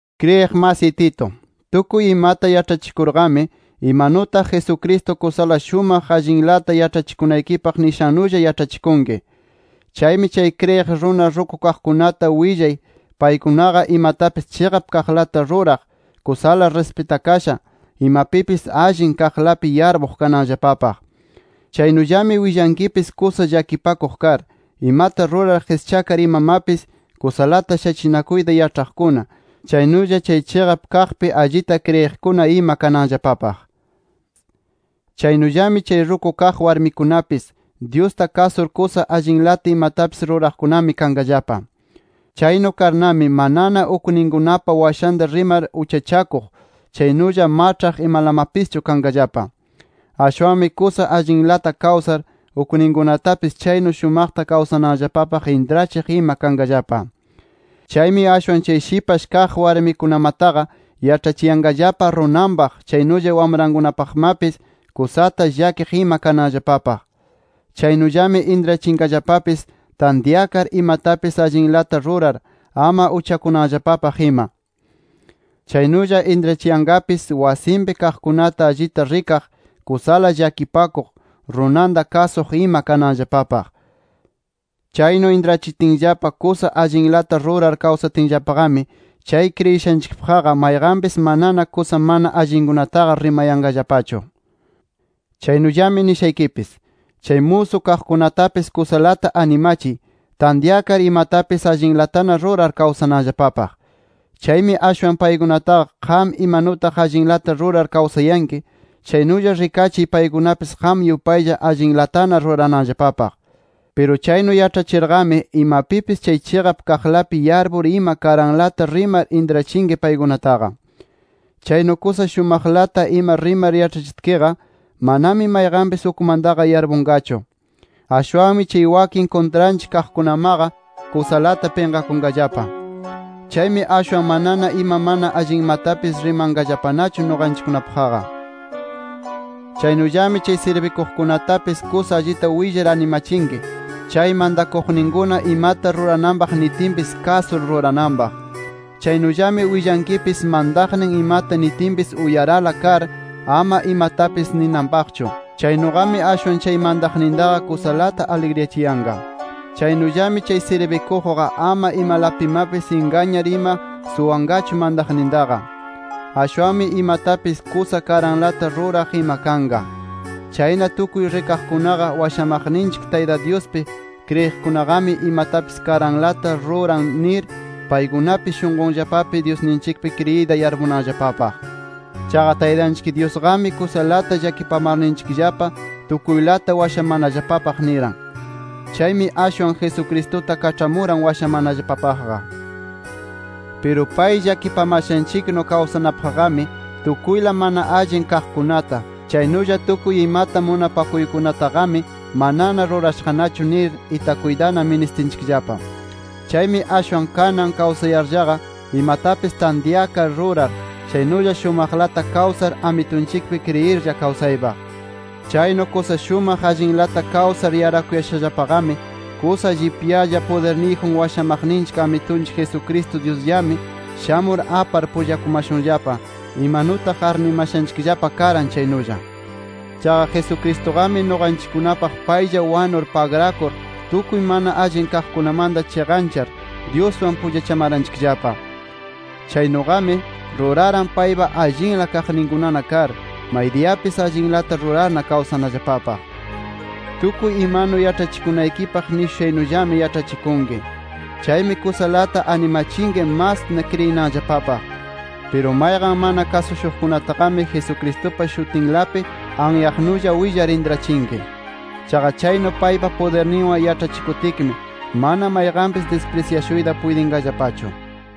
Kriyiq masiy Tito, tukuy imata yaĉhachikurqami, imanutaq Jesucristo kusala shumaq allinlata yaĉhachikunaykipaq nishannulla yaĉhachikunki. Chaymi chay kriyiq runa ruku kaqkunata willay paykunaqa imatapis chiqap kaqlata ruraq, kusala rispitakasha, imapipis allin kaqlapi yarpuq kananllapapaq. Chaynullami willankipis kusa llakipakuq kar imata rurar qischakar imamapis kusalata shachinakuyta yaĉhaqkuna, chaynulla chay chiqap kaqpi allita kriyiqkuna ima kananllapapaq. Chaynullami chay ruku kaq warmikunapis, Dyusta kasur kusa allinlata imatapis ruraqkunami kanqallapa. Chaynu karnami, manana ukninkunapa washanta rimar uchachakuq, chaynulla maĉhaq imalamapischu kanqallapa. Ashwanmi kusa allinlata kawsar, ukninkunatapis chaynu shumaqta kawsananllapapaq intrachiq ima kanqallapa. Chaymi ashwan chay shipash kaq warmikunamataqa, yaĉhachiyanqallapa runanpaq, chaynulla wamrankunapaqmapis kusata llakiq ima kananllapapaq. Chaynullami intrachiyanqallapapis tantyakar, imatapis allinlata rurar, ama uchakunanllapapaq ima. Chaynulla intrachiyanqapis wasinpi kaqkunata allita rikaq, kusala llakipakuq, runanta kasuq ima kananllapapaq. Chaynu intrachitinllapa, kusa allinlata rurar kawsatinllapaqami, chay kriyishanchikpaqqa mayqanpis manana kusa mana allinkunataqa rimayanqallapachu. Chaynullami nishaykipis: Chay musu kaqkunatapis kusalata animachiy, tantyakar imatapis allinlatana rurar kawsananllapapaq. Chaymi ashwan paykunataqa qam imanutaq allinlata rurar kawsayanki, chaynulla rikachiy paykunapis qam yupaylla allinlatana rurananllapapaq. Piru chaynu yaĉhachirqami, imapipis chay chiqap kaqlapi yarpur ima karanlata rimar intrachinki paykunataqa. Chaynu kusa shumaqlata ima rimar yaĉhachitkiqa, manami mayqanpis ukmantaqa yarpunqachu. Ashwanmi chay wakin kuntranchik kaqkunamaqa, kusalata pinqakunqallapa. Chaymi ashwan manana ima mana allinmatapis rimanqallapanachu nuqanchikkunapaqqa. Chaynullami chay sirbikuqkunatapis kusa allita willar animachinki, chay mantakuqninkuna imata rurananpaq nitinpis kasur rurananpaq. Chaynullami willankipis mantaqnin imata nitinpis uyarala kar ama imatapis ninanpaqchu. Chaynuqami ashwan chay mantaqnintaqa kusalata aligriyachiyanqa. Chaynullami chay sirbikuqqa ama imalapimapis ingañar ima suwanqachu mantaqnintaqa. Ashwanmi imatapis kusa karanlata ruraq ima kanqa. Chayna tukuy rikaqkunaqa washamaqninchik Tayta Dyuspi kriyiqkunaqami imatapis karanlata ruran nir, paykunapis shunqunllapapi Dyusninchikpi kriyiyta yarpunanllapapaq. Chaqa Taytanchik Dyusqami kusalata llakipamarninchikllapa tukuylata washamanallapapaq niran. Chaymi ashwan Jesucristuta kaĉhamuran washamanallapapaqqa. Piru pay llakipamashanchiknu kawsanapaqqami tukuyla mana allin kaqkunata, chaynulla tukuy imata munapakuykunataqami manana rurashaqnachu nir, itakuytana ministinchikllapa. Chaymi ashwan kanan kawsayarllaqa imatapis tantyakar rurar, chaynulla shumaqlata kawsar Amitunchikpi kriyirlla kawsaypaq. Chaynu kusa shumaq allinlata kawsar yarakuyashallapami, kusa llipyala pudirniyjun washamaqninchik Amitunchik Jesucristo Dyusllami, shamur apar pullakumashunllapa, imanutaq arnimashanchikllapa karan chaynulla. Chaqa Jesucristuqami nuqanchikkunapaq paylla wanur pagrakur tukuy mana allin kaqkunamanta chiqanchar Dyuswan pullachamaranchikllapa. Chaynuqami, ruraran paypa allinla kaqninkunana kar, maydiyapis allinlata rurarna kawsanallapapaq. Tukuy imanu yaĉhachikunaykipaq nishushaynullami yaĉhachikunki. Chaymi kusalata animachinki mas kriyinanllapapaq. Piru mayqan mana kasushuqkunataqami, Jesucristupa shutinlapi anyaqnulla willar intrachinki. Chaqa chaynu paypa pudirninwan yaĉhachikutkimi mana mayqanpis disprisyashuyta puytinqallapachu.